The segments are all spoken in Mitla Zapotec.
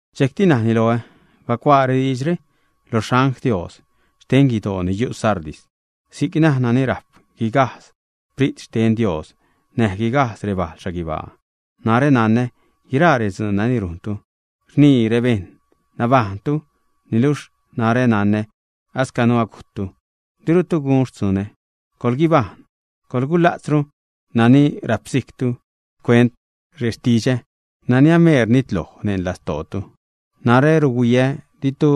Dxejcti najni loä: ―Bacuaa rediidxre lo xangl Dios xten guidoo ni yu' Sardis: “Si'c naj nani rajp guigajdz Sprit xten Dios näj guigajdz rebal xhaguibaa: Narä nanä guiraa redzuun nani rujntu, rnii rebejṉ nabajṉtu, niluxh narä nanä ascanu agujttu, dirutu gun xtzunä. Coḻguibajṉ, coḻgula'tzru nani rapsijctu xcuent rextidxä nani ameer nitloj neṉ lastootu. Narä ruhuiä ditu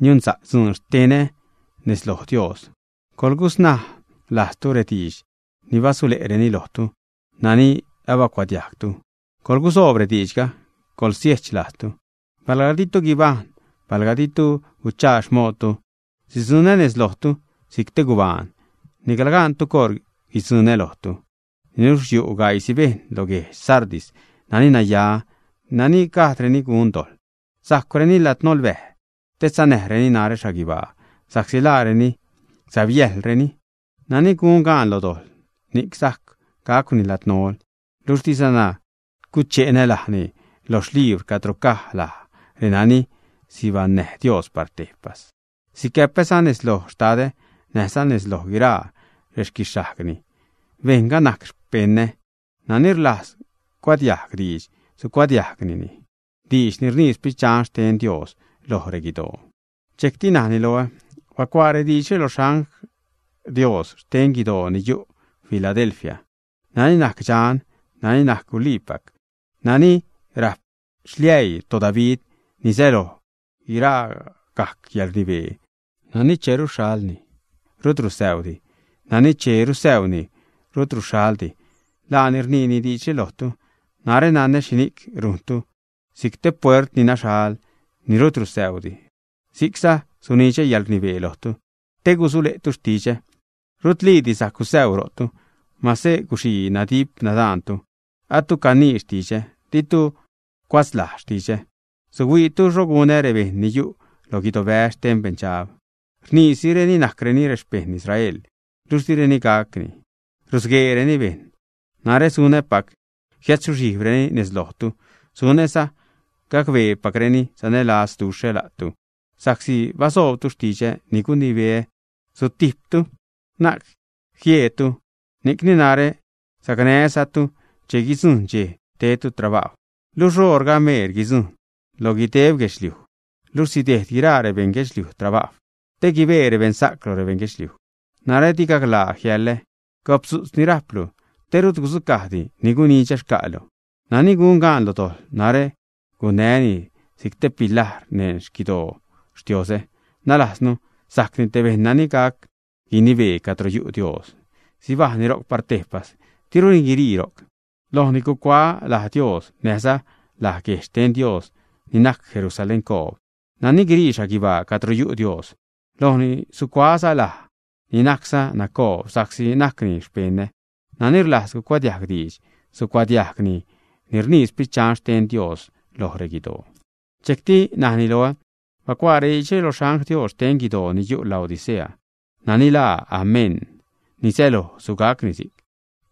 niunsa'c dzuun xtenä nez loj Dios. Coḻgusnaj lajztu rediidx ni basule'reni lojtu, nani abacuadiajgtu, coḻgusoob rediidxga, coḻgusiech lajztu. Palga ditu guibajṉ, palga ditu guchaa xmoodtu, sidzuṉä nez lojtu si'c te gubaan, nicla gaantu coṟ guidzuṉä lojtu. Niluxh yu' gaiisi bejṉ lo guedx Sardis nani naya, nani gajdreni gun dojḻ. Sajcwreni ladnolbäj te sanäreni narä xhaguibaa, sa'csi laareni säbyäjḻreni. Nani gun gaan lo dojḻ, ni'c sajc gacwni ladnol, luxh dizana guche'nä lajni loj xlibr cadro caj laj renani sibajṉnäj Dios par tejpas. Sicäpäza nez loj Xtadä näjza nez loj guiraa rexquixhajgni, bejṉga najc rexpeṉä. Nani rlajz cuadiajg diidx, sucuadiajgni diidx ni rnii Sprit Dxan xten Dios loj reguidoo.” Dxejcti najni loä: ―Bacuaa rediidxre lo xangl Dios xten guidoo yu' Filadelfia: “Nani najc dxan, nani najc guliipac, nani rajp xliäii toDavid (ni säloj guiragajc yäḻrnibee), nani che ruxhalni, rut rusäuudi, nani che rusäuuni, rut ruxhaldi, laani rniini diidxre lojtu: Narä nanä xhini'c rujntu. Si'c te puert ni naxhal, ni rut rusäudi, si'cza sunidxä yäḻrnibee lojtu te gusule'tu xtidxä, rutliidi sajc gusäuu ro'tu. Mase guxii nadip-nadaantu, atu canii xtidxä, ditu cuatzlajz xtidxä. Suhuiitu xho gunä rebejṉ ni yu' lo guidobäz xten beṉdxab. Rniisireni najcreni xpejṉ Israel, luxh direni gac; rusgueereni bejṉ. Narä sunäpac jiädzuxhijbreni nez lojtu, sunäza gacbeepacreni sanälazduxhä la'tu. Sa'csi basoobtu xtidxä ni gunibeä sutijptu, na'c jieedtu, ni'cni narä sacnää́zatu che guidzujṉ dxej tedtu trabajw. Luxh oṟga ameer guidzujṉ lo guideb guedxliuj, luxh sidejd guiraa rebeṉ guedxliuj trabajw, te guibee rebeṉsa'c lo rebeṉ guedxliuj. Narä di gaclaa jiäḻä; gopdzu'tz ni rajptu, te rut gudzucajdi ni gunidxä xca'tu. Nani gun gaan lo dojḻ, narä gunäni si'c te pilajr neṉ xquidoo Xtioozä, nalajznu, sajcni te bejṉ nani gac guinibee cadro yu' Dios. Sibajṉni ro'c par tejpas, diruni guirii ro'c. Lojni gucuaä laj Dios näjza laj guejdx xten Dios ni najc Jerusaléncoob, nani guirii xhaguibaa cadro yu' Dios; lojni sucuaäza laä ni najcza nacoob sa'csi najcni xpeṉä. Nani rlajz cuadiajg diidx, sucuadiajgni ni rnii Sprit Dxan xten Dios loj reguidoo.” Dxejcti najni loä: ―Bacuaa rediidxre lo xangl Dios xten guidoo ni yu' Laodicea: “Nani laa Amén (ni säloj sugacni si'c),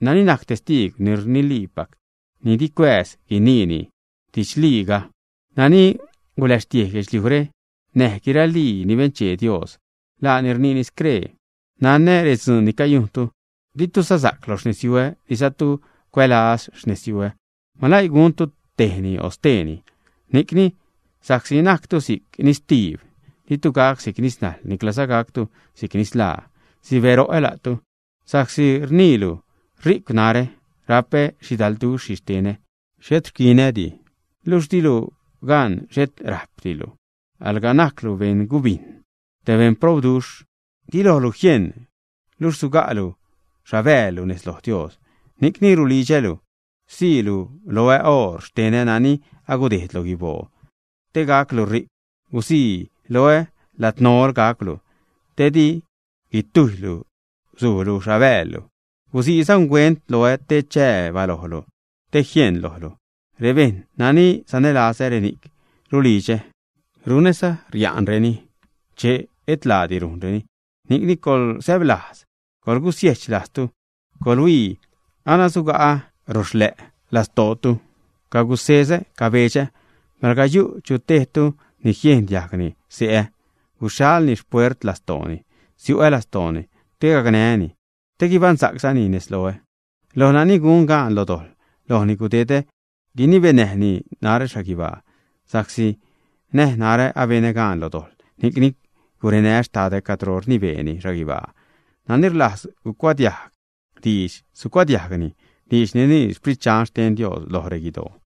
nani najc testiigw ni rniliipac, ni di cuääz guiniini didxliiga, nani guläxtiej guedxliujre näj guiralii ni benchee Dios, laani rniini scree: Nanä redzuun ni cayujntu. Ditu sasa'c lo xnezyuä, dizatu cuälaz xnezyuä. ¡Maläii guntu tejni o steeni! Ni'cni, sa'csi najctu si'c nistiib, ditu gac si'c nisnajḻ, niclaza gactu si'c nislaa, sibäro'ä la'tu. Sa'csi rniilu: Ri'cw narä, rapä xhidalduxh xhixtenä, xhet rquinädi. Luxh dilu gan xhet rajpdilu, alga najclu beṉ gubijn, te beṉ probduxhlu, di lojlu jien, luxh suga'lu xhabäälu nez lo Dios. Ni'cni rulidxälu siilu loä oor xtenä nani agudejd lo guiboo te gaclu ri'cw; gusii loä ladnol gacwlu, te di guitujylu suulu xhabäälu; gusiiza unguent loä te chää balojlu, te jieṉ lojlu. Rebejṉ nani sanälazä, reni'c rulidxä, runäza riareni che et laadi rujnreni. Ni'cni coḻsäblajz; coḻgusiejch lajztu. Coḻhuii, ana suga'ä roxlä' lastootu, cagusezä, cabedxa'ä. Palga yu' chu tejtu ni jiejn diajgni xse'ä, guxhalni xpuert lastooni, siu'ä lastooni, te gacnää́ni, te guibaṉsa'czani nez loä. Loj nani gun gaan lo dojḻ, lojni gudedä guinibenäjni narä xhaguibaa, sa'csi näj narä abenä gaan lo dojḻ, ni'cni gurenää́ Xtadä cadro rnibeeni xhaguibaa. Nani rlajz cuadiajg diidx, sucuadiajgni diidx ni rnii Sprit Dxan xten Dios loj reguidoo.”